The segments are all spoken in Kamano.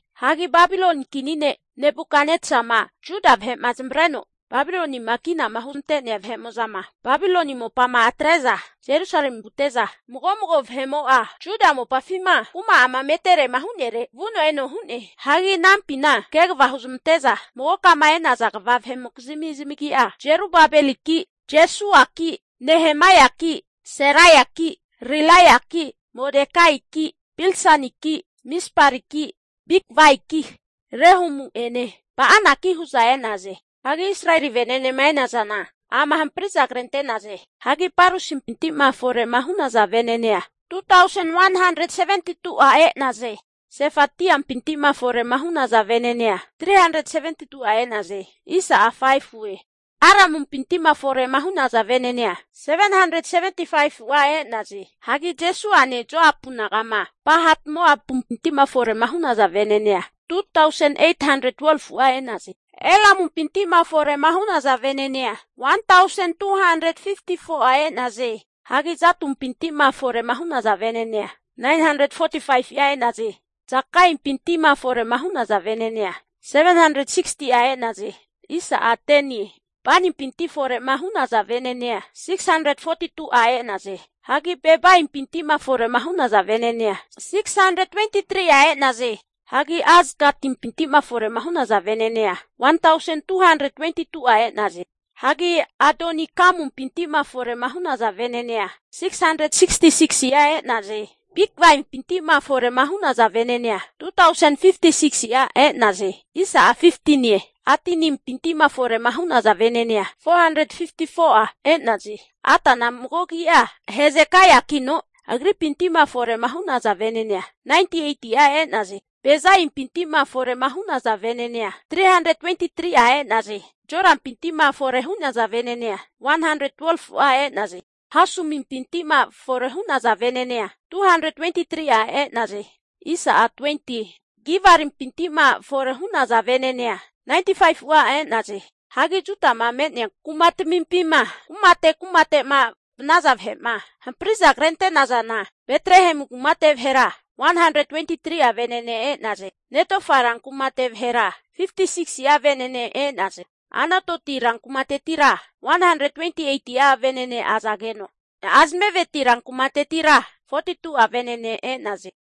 Hagi Babiloni kini ne' Nebukatnesa'ma Juda vahe'ma zamavareno Babilonima kinama huzmante'nea vahe'mo'zama Babiloni mopama atre'za Jerusalemi vute'za, mago mago vahe'mo'a Juda mopafima kuma'ama meterema hu'nere vuno eno hu'ne. Hagi anampina kegava huzmante'za magokama e'nazana kva vahe'mokizmi zamagi'a, Jerubabeliki, Jeshuaki, Nehemaiaki, Seraiaki, Rilaiaki, Modekaiki, Bilshaniki, Mispariki, Bigvaiki, Rehumi'ene Ba'anaki hu'za e'naze. Hagi Israeli venenema e'nazana ama hampri'za krente'naze. Hagi Parosimpinti'ma fore hu'naza venenea 2tausen 172'a e'naze. Sefatiampinti'ma fore'ma hu'naza venenea 372'a e'naze. Aramumpinti'ma fore hu'naza venenea 775'a e'naze. Hagi Jeshuane Joapu naga'ma Pahat-Moapumpinti'ma fore hu'naza venenea 2tausen 812'a e'naze. Elamumpinti'ma fore'ma hu'naza venenea 1tausen 254'a e'naze. Hagi Zatumpinti'ma fore'ma hu'naza venenea 945'a e'naze. Zakaimpinti'ma fore'ma hu'naza venenea 760'a e'naze. Banipinti'ma fore'ma hu'naza vene'nea 642'a e'naze. Hagi Bebaimpinti'ma fore'ma hu'naza venenea 623'a e'naze. Hagi Azagatimpinti'ma fore'ma hu'naza venenea 1tausen 222'a e'naze. Hagi Adonikamumpinti'ma fore'ma hu'naza venenea 666si'a e'naze. Hagi Bigvaimpinti'ma fore'ma hu'naza venenea 2tausen 56si'a e'naze. Adinimpinti'ma fore'ma hu'naza venenea 454'a e'naze. Atana mago agi'a Hezekaiakino, agripinti'ma fore hu'naza venenea 98'a e'naze. Bezaimpinti'ma fore hu'naza venenea 323'a e'naze. Jorapinti'ma fore hu'naza venenea 112fu'a e'naze. Hashumimpinti'ma fore hu'naza venenea 223'a e'naze. Gibarimpinti'ma fore hu'naza venenea 95'a e'naze. Hagi Judama me'nea kumatamimpima, kumate kumate'ma vanaza vahe'ma hampri'za krente'nazana, Betlehemu kumate vahera 123'a venene e'naze. Netofa rankumate vahera 56si'a venene e'naze. Anatoti rankumatetira 128'a venene azageno, Azmaveti rankumatetira 42'a venene e'naze.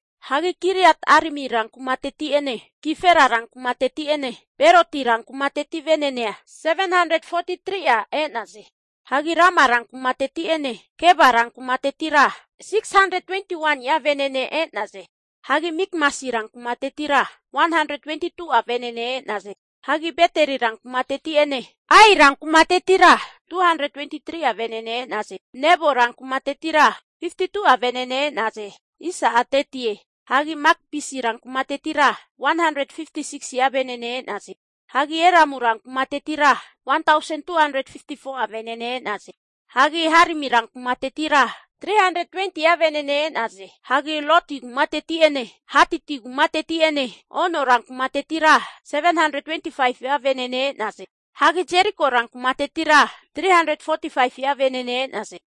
Hagi Kiriat-arimi rankumateti'ene Kefira rankumateti'ene Beroti rankumateti venenea 743'a e'naze. Hagi Rama rankumateti'ene Geba rankumatetira 621ni'a vene'ne e'naze. Hagi Mikmasi ran kumatetira 122'a venene e'naze. Hagi Beteli rankumateti'ene Ai rankumatetira 223'a venene e'naze. Nebo rankumatetira 52'a vene'ne e'naze. Hagi Magbisi ran kumatetira 156si'a venene e'naze. Hagi Elamu rankumatetira 1tausen 254'a vene'ne e'naze. Hagi Harimi ran kumatetira 320'a venene e'naze. Hagi Lodi kumateti'ene Haditi kumateti'ene, Ono rankumatetira 725'a venene e'naze. Hagi Jeriko rankumatetira 345'a venene e'naze.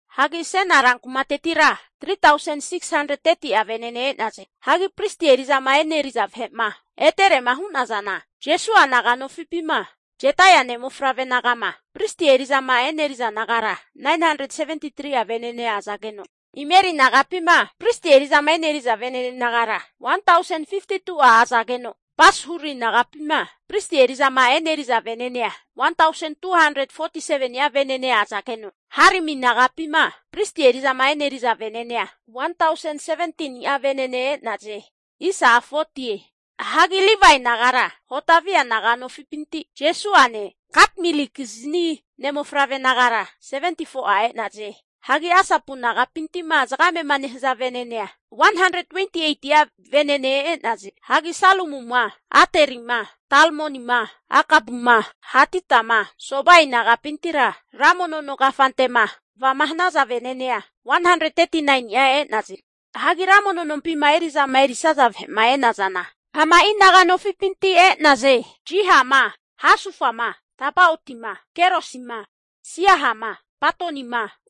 Hagi Sena rankumatetira 3tausen 630'a venene e'naze. Hagi pristi eri'zama eneri'za vahe'ma eterema hu'nazana, Jeshua naga'nofipima Jedaia ne' mofavre naga'ma pristi eri'zama eneriza nagara 973'a venene azageno, Imeri nagapima pristi eri'zama eneri'za venene nagara 1tausen 52'a azageno, Pashuri nagapima pristi eri'zama eneriza venenea 1tausen 247ni'a azageno, Harimi nagapima pristi eri'zama eneriza venenea 1tausen 17ni'a venene e'naze. Hagi Livae nagara, Hodavia naga'nofipinti, Jeshuane Katmielikizni ne' mofavre nagara 74'a e'naze. Hagi Asapu nagapintima zagame'ma nehaza venenea 128'a venene e'naze. Hagi Salumuma Aterima, Talmonima, Akubuma, Hatitama, Sobai naga'pintira ra mono nonkafante'ma kvama hanaza vene'nea 139ni'a e'naze. Hagi ra mono nompima eri'zama erisaza vahe'ma e'nazana, ama'i naga'nofipinti e'naze. Zihama, Hasufama, Tabaotima, Kerosima, Siahama, Padonima,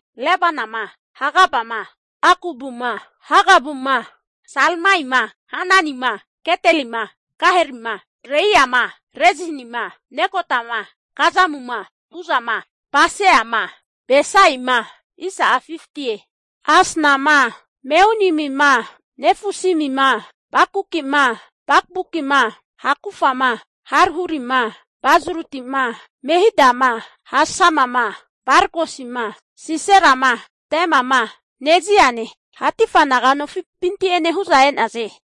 Lebanama, Hagabama, Akubuma, Hagabuma, Salmaima, Hananima, Gidelima, Gaharima, Reaiama, Rezinima, Nekodama, Gazamuma, Uzama, Paseama, Besaima, Asnama, Meunimima, Nefusimima, Bakbukima, Hakufama, Harhurima, Bazlutima, Mehidama, Hashamama, Barkosima, Siserama, Temama, Neziane, Hatifa naga nofipinti'ene hu'za e'naze.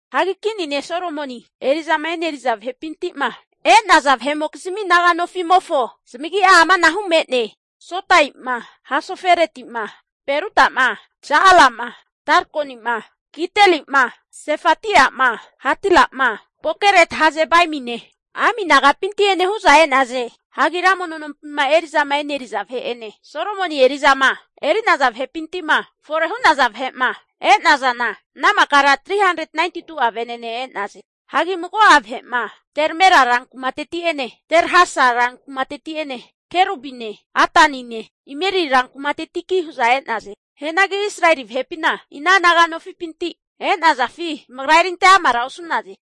Hagi kini ne' Solomoni eri'zama eri'naza vahepinti'ma e'naza vahe'mokizmi naga nofi'mofo zamagi'a amanahu me'ne, Sotaima, Hasofereti'ma, Perudama, Ja'alama, Darkonima, Gidelima, Sefatiama, Hatilima Pokeret-Hazebaimine, Ami nagapinti'ene hu'za e'naze. Hagi ra mono nompima eri'zama eri'naza vahe'ene, Solomoni eri'zama eri'naza vahepinti'ma fore hu'naza vahe'ma e'nazana ana makara 392'a venene e'naze. Hagi mago'a vahe'ma Tel Mela ran kumateti'ene Tel Harsa rankumateti'ene Kerubine, Adanine, Imeri rankumateki hu'za e'naze. Hianagi Israeli vahepina ina naga nofipinti e'nazafi zamagra erinte'amara osu'naze.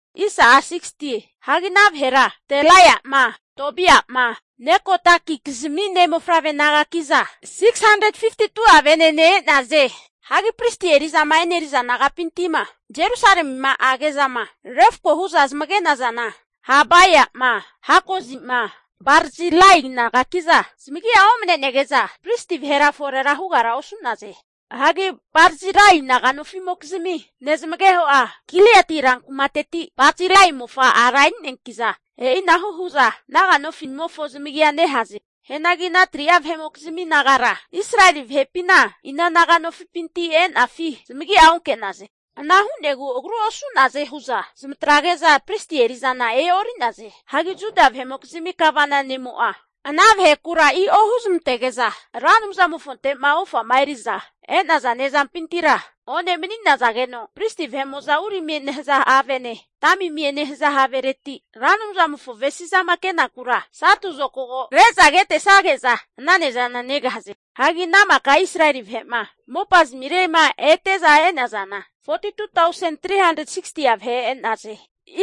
Hagi ana vahera, Delaiama, Tobiama, Nekodakizmi ne' mofavre nagaki'za 652'a venene e'naze. Hagi pristi eri'zama e'neriza nagapintima Jerusalemima age'zama refako hu'za zamage'nazana Habaiama, Hakozima, Barzilai nagaki'za zamagia omnenege'za, pristi vahera fore hugara osu'naze. Hagi Barzilai naga nofi'mokizmi nezamageho'a, Gileadi ran kumateti Barzilai mofa ara eri'neanki'za, e'inahu hu'za naga nofi'zamimofo zamagia nehaze. Hianagi ana 3'a vahe'mokizmi nagara Israeli vahepina ina naga'nofipinti e'nafi zamagia onke'naze. Ana hu'negu agru osu'naze hu'za zamatrazage'za, pristi eri'zana e'ori'naze. Hagi Juda vahe'mokizmi gavana ne'mo'a ana vahekura i'o huzamantege'za Ra Anumzamofonte'ma ofama eri'za e'naza ne'zampintira one mani'nazageno pristi vahe'mo'za Urimie nehaza havene Tamimie nehaza havereti Ra Anumzamofo avesi'zama kenakura satu zokago re'za ketesage'za, ana ne'zana negahaze. Hagi ana maka Israeli vahe'ma mopa zamire'ma ete'za e'nazana 42tausen 360'a vahe e'naze.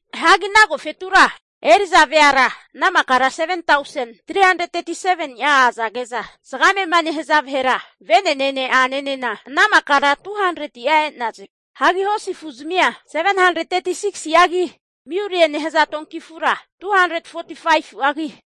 Hagi ana agofetura eri'za veara ana makara 7tausen 337ni'a azage'za, zagame'ma nehaza vahera venenene a'nenena ana makara 200'a e'naze. Hagi hosi afuzmia 736si'agi miulie nehaza donki afura 245fu'agi,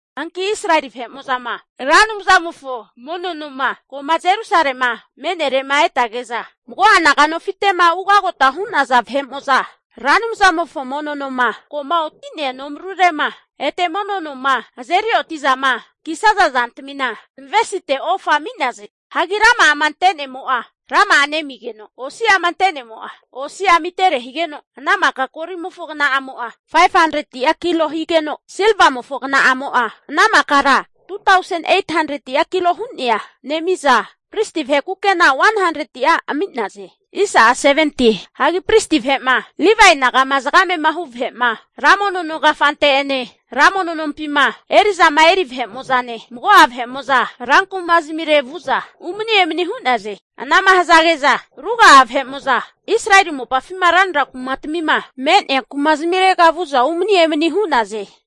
Hanki Israeli vahe'mo'zama Ra Anumzamofo mono noma ko'ma Jerusalema me'nere'ma etage'za, mago'a naganofite'ma ugota hu'naza vahe'mo'za Ra Anumzamofo mono noma ko'ma oti'nea nomarure'ma ete mono noma azerioti'zama kisaza zantamina, zamavesite ofa ami'naze. Hagi rama'ama ante'nemo'a rama'a nemigeno, osi'ama ante'nemo'a osi'a amitere higeno ana maka golimofo kna'amo'a 500'a kilo higeno, silvamofo kna'amo'a ana makara 2tausen 800'a kilo hu'nea nemi'za pristi vahe kukena 100'a ami'naze. Hagi pristi vahe'ma Livae naga'ma zagame'ma hu vahe'ma ra mono nonkafante'ene, ra mono nompima eri'zama eneriza vahe'mo'zane mago'a vahe'mo'zanena ran kumazamire vu'za umani emani hu'naze. Anama hazage'za ruga'a Israeli mopafima ranra kumatamima me'nea kumazmirega vu'za umani emani hu'naze.